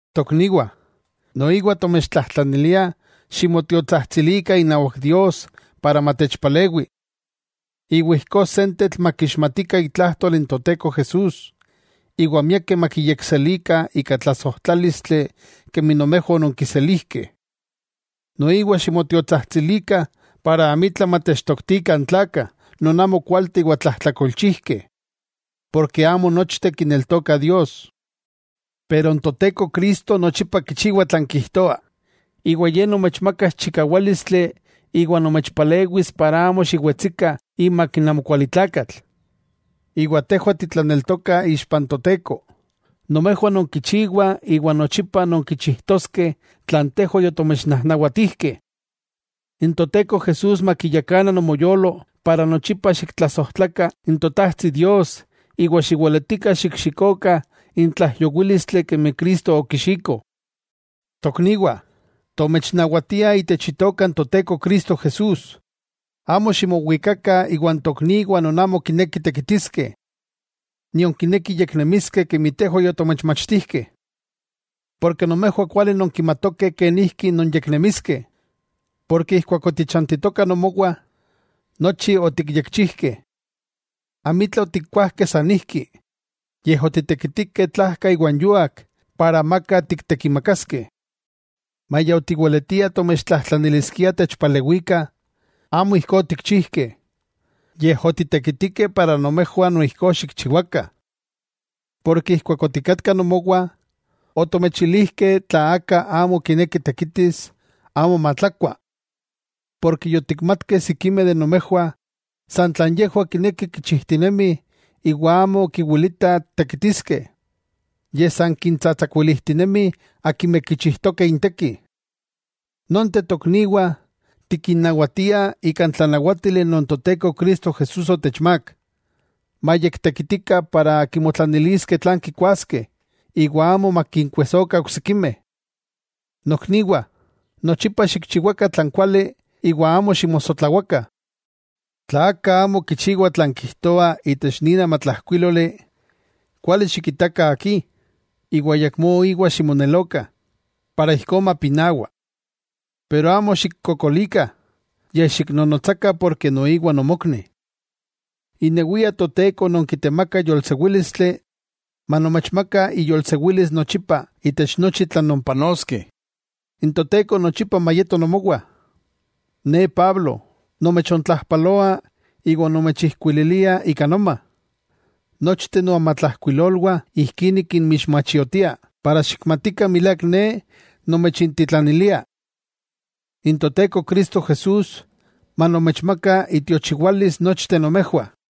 Tokniwah, noiwa tomechtlajtlaniliah ximotiotsajtsilikah inawak Dios para matechpalewi, iwa ijkó sentetl makixmatikah itlajtol n Toteko Jesús, iwa miakeh makiyekselikah ika tlasojtlálistli kemi nomejwah ononkiselijkeh. Noiwa ximotiotsajtsilikah para amitla matechtoktikah n tlakah non amo kualteh iwa tlajtlakolchijkeh, porke amo nochteh kineltokah Dios. Pero n Toteko Cristo, nochipa kichiwa tlan kijtoa, iwa Ye nomechmakas chikawálistli iwa nomechpalewis para amo xiwetsikah imak n amokualitlakatl. Iwa tejwah titlaneltokah ixpa n Toteko nomejwah nonkichiwah iwa nochipa nonkichijtoskeh tlan tejwah yotomechnajnawatijkeh. N Toteko Jesús makiyakana nomoyolo iwa nochipa xiktlasojtlakah n Totajtsi Dios iwa xiweletikah xikxikokah n tlaijyowílistli kemi Cristo okixiko. Tokniwah, tomechnawatiah itech Itoka n Toteko Cristo Jesús, amo ximowikakah iwan tokniwah non amo kinekih tekitiskeh, nion kinekih yeknemiskeh kemi tejwah yotomechmachtijkeh. Porke nomejwah kuali nonkimatokeh kenijki nonyeknemiskeh. Porke ijkuak otichantitokah nomowah, nochi otikyekchijkeh. Amitla otikkuajkeh sanijki. Yej otitekitikeh tlajka iwan yúak, para amaka tiktekimakaskeh. Maya otiweletiah tomechtlajtlaniliskiah techpalewikah, amo ijkó otikchijkeh, yej otitekitikeh iwa nomejwah noijkó xikchiwakah. Keman otikatkah nomowah, otomechilijkeh tla aka amo kineki tekitis, amo matlakua. Porke otikmatkeh sikimeh de nomejwah san tlan yejwah kinekih kichijtinemih iwa amo kiwilitah tekitiskeh, yej san kintsatsakuilijtinemih akimeh kichijtokeh intekih. Nonteh tokniwah, tikinnawatiah ika n tlanawátili non Toteko Cristo Jesús otechmák, mayektekitikah para kimotlaniliskeh tlan kikuaskeh iwa amo makinkuesokah oksikimeh. Nokniwah, nochipa xikchiwakah tlan kuali iwa amo ximosotlawakah. Tla aka amo kichiwa tlan tikijtoah itech nin amatlajkuíloli, kuali xikitakah akí, iwa ayakmó íwa ximonelokah, para ijkó mapinawa. Amo xikkokolikah, yej xiknonotsakah porke noiwa nomokni. Inewia Toteko non kitemaka yolsewílistli, manomechmaka iyolsewilis nochipa itech nochi tlan nonpanoskeh. N Toteko nochipa mayeto nomowah. Ne Pablo, nomechontlajpaloa iwa nomechijkuililia ika noma. Nochteh noamatlajkuilolwah ijkí nikinmixmachiotia para xikmatikah milák ne nomechintitlanilia. N Toteko Cristo Jesús manomechmaka itiochiwalis nochteh nomejwah.